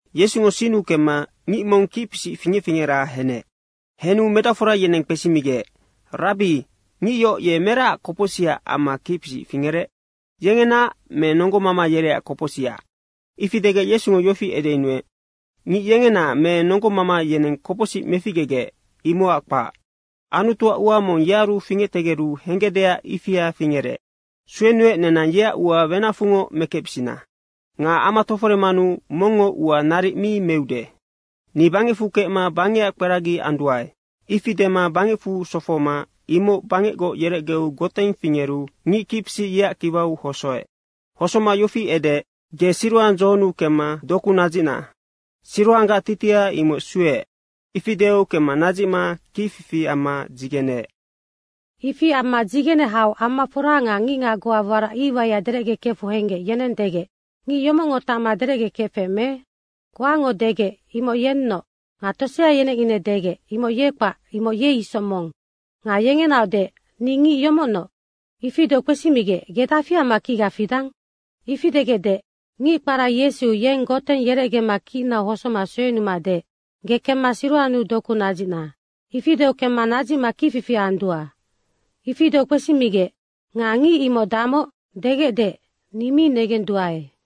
Yesungo sinnu kemma ngic mong kicpisic fingec fingera henec. Henu medacfora yeneng kpesimigec, “Rabbi, ngic yoc meracac kopocsicac amma kicpisic fingerec? Yengenaac me nonggomama yereac kopocsicac?” Ifi degec Yesungo yofi edeyunuec, “Ngic yengena me nonggomama yeneng kopocsic meficgegec, imocac kpac. Anutuac ua mong yearu fingectegeru henggecdeac ifia fingerec. Suenuec, nenang yeac ua wenacfungoc mekecbisina. Nga ama toforemanu mongngo ua naric mi meude. Ni bangecfu kecma bangecac kperagi anduae.” Ifi dema bangecfu sofohoma imoc bangecgoc yerecgeu goteng fingeru ngic kicpisic yeac kiwau hosoec. Hosoma yofi edeec, “Ge Siroang dzohonnu kemma doku nadzicna.” (Siroanggac titiha imoc “Sueec.”) Ifi deu kemma nadzicma kicfifi amma dzigeneec. Ifi amma dzigene hau amafora nga ngicngac goa warac iwaiac derecgekefu henggec, yeneng degec, “Ngic yomocngo tacma derecgekefec me?” Goango degec, “Imoc yennoc.” Nga tosea yeneng ine degec, “Imoc ye kpac, imoc ye isoc mong.” nga yengenaoc deec, “Ni ngic yomocnoc.” Ifi deu kpesimigec, “Ge dafi amma kicga fidang?” Ifi degec deec, “Ngic kpara Yesu, yeng goteng yerecgema kicnau hosoma suenuma deec, ‘Ge kemma Siroannu doku nadzicna.’ ifi deu kemma nadzicma kicfifi andua.” Ifi deu kpesimigec, “Nga ngic imoc damoc?” degec deec, “Ni mi negenduae.”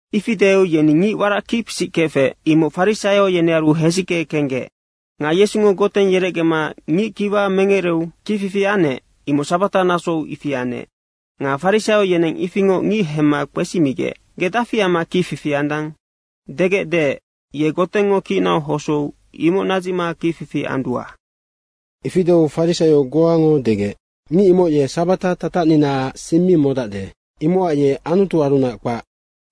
Ifi deu yeni ngic warac kicpisic kefec, imoc farisaio yenearu hesicke kenggec. Nga Yesungo goteng yerecgema ngic kiwa merecgeu kicfifi anec, imoc sabata nasou ifi anec. Nga farisaio yeneng ifingoc ngic hemma kpesimigec, “Ge dafi amma kicfifi andang?” degec deec, “Ye gotengngo kicnau hosou imoc nadzicma kicfifi andua.” Ifi deu farisaio goango degec, “Ngic imoc ye sabata tatacninaac sing mi modacde, imocac ye Anutuarunac kpac.”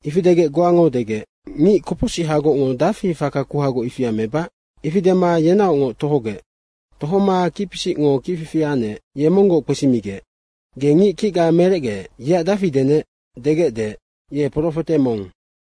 Ifi degec goango degec, “Ngic kopocsihagocngo dafi faka kuhagoc ifia mebac?” Ifi dema yenaocngoc tohogec. Tohoma kicpisicngo kicfifi anec, ye monggoc kpesimigec, “Ge ngic kicga merecgeec, yeac dafi denec?” degec deec, “Ye profete mong.”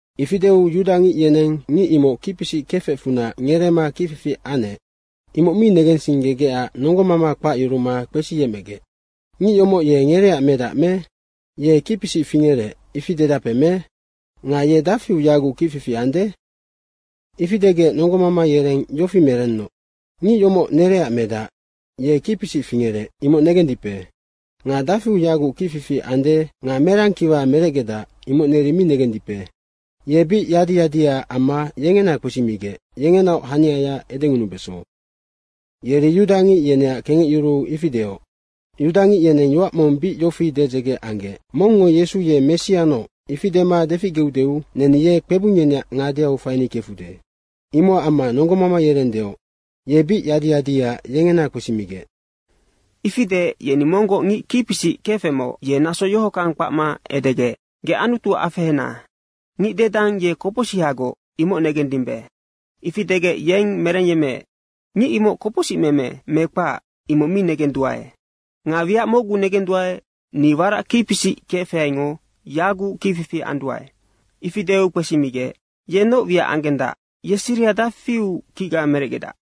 Ifi deu yudangic yeneng ngic imoc kicpisic kefecfunac ngereema kicfifi anec, imoc mi negensinggegecac nonggomama kpacyuruma kpesiyecmegec, “Ngic yomoc ye ngereac medac me? Ye kicpisic fingerec, ifi dedape me? Nga ye dafiu yaguc kicfifi ande?” Ifi degec nonggomama yereng yofi merennoc, “Ngic yomoc nereac medac. Ye kicpisic fingerec, imoc negendipe. Nga dafiu yaguc kicfifi ande nga merang kiwa merecgedac, imoc neri mi negendipe. Ye bic yadi yadiaac amma yengena kpesimigec, yengenaoc haniaya edengunubeso.” Yeri yudangic yeneac kengecyuruu ifi deoc. Yudangic yeneng yoac mong bic yofi dedzege anggec, “Mongngo Yesu ye Messianoc ifi dema deficgeudeu neni ye kpebung yeneac ngadeau faini kefude.” Imocac amma nonggomama yereng deoc, “Ye bic yadi yadiaac yengena kpesimigec.” Ifi deec yeni monggoc ngic kicpisic kefecmoc, ye naso yohockang kpacma edegec, “Ge Anutu afehena. Ngic dedang, ye kopocsihagoc, imoc negemmidimbe.” Ifi degec, yeng merengyemmeec, “Ngic imoc kopocsicmeme me kpac, imoc mi negenduae. Nga wiac mocgu negenduae, ni warac kicpisic kefaingo yaguc kicfifi anduae.” Ifi deu kpesimigec, “Ye noc wiac anggendac? Ye siriha dafiu kicga merecgedac?”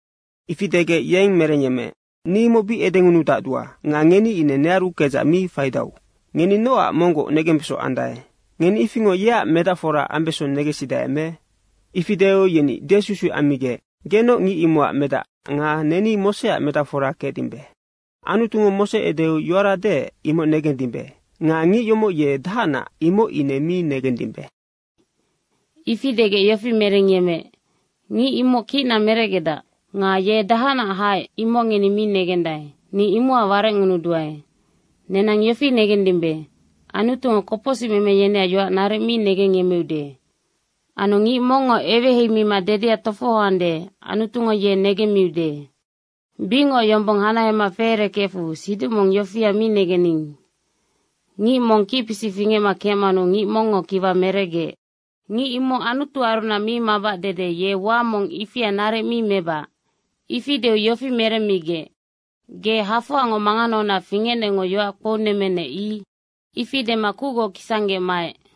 Ifi degec yeng merengyemmeec, “Ni imoc bic edengunudacdua nga ngeni ine nearu kedzac mi faidau. Ngeni nocac monggoc negembeso andae? Ngeni ifingoc yeac medacfora ambeso negensidae me?” Ifi deu yeni desusuic ammigec, “Genoc ngic imocac medac nga neni Moseac medacforango kecdimbe. Anutungo Mose edeu yoara deec, imoc negendimbe. Nga ngic yomoc ye dahacnac, imoc ine mi negemmidimbe.” Ifi degec yofi merengyemmeec, “Ngic imoc kicna merecgedac. Nga ye dahacnac haec, imoc ngeni mi negendae. Ni imocac warecngunuduae. Nenang yofi negendimbe, Anutungo kopocsicmeme yeneac yoac naric mi negengyemmeude. Anu ngic mongngo eweheimima dedea tofohoande, Anutungo ye negemmiude. Bicngoc yombong hanahema feerekefecfu siduc mong yofia mi negenning, ‘Ngic mong kicpisic fingecma kecmanu ngic mongngo kiwa merecgeec.’ Ngic imoc Anutuarunac mi mabac dede, ye ua mong ifia naric mi mebac.” Ifi deu yofi meremmigec, “Ge hafoangoc manganaunac fingecnecngo yoac kpounemmenec, i.” Ifi dema kucgoc kisanggec maec.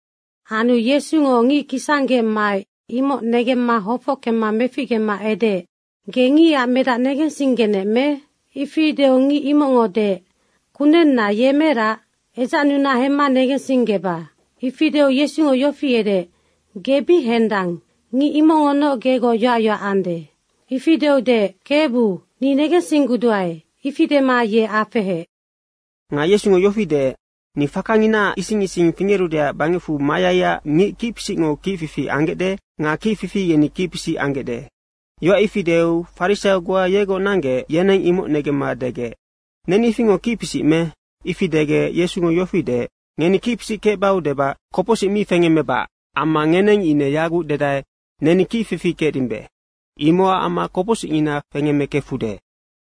Anu Yesungo ngic kisanggec maec, imoc negemma hofockemma meficgema edeec, “Ge ngicac medac negensinggenec me?” Ifi deu ngic imocngo deec, “Kunenna, ye merac? Edzacnuna hemma negensinggeba.” Ifi deu Yesungo yofi edeec, “Ge bic hendang. Ngic imocngonoc gegoc yoac yoac ande.” Ifi deu deec, “Kebu, ni negensingguduae.” Ifi dema ye afeheec. Nga Yesungo yofi deec, “Ni fakanginaac ising ising fingerudeac bangecfu mayaiac ngic kicpisicngo kicfifi anggecde nga kicfifi yeni kicpisic anggecde.” Yoac ifi deu farisaio goa yegoc nanggec, yeneng imoc negemma degec, “Neni ifingoc kicpisic me?” Ifi degec Yesungo yofi deec, “Ngeni kicpisic kecbau debac kopocsic mi fengemmebac amma ngeneng ine yaguc dedae, ‘Neni kicfifi kecdimbe.’ imocac amma kopocsicngina fengemmekefude.”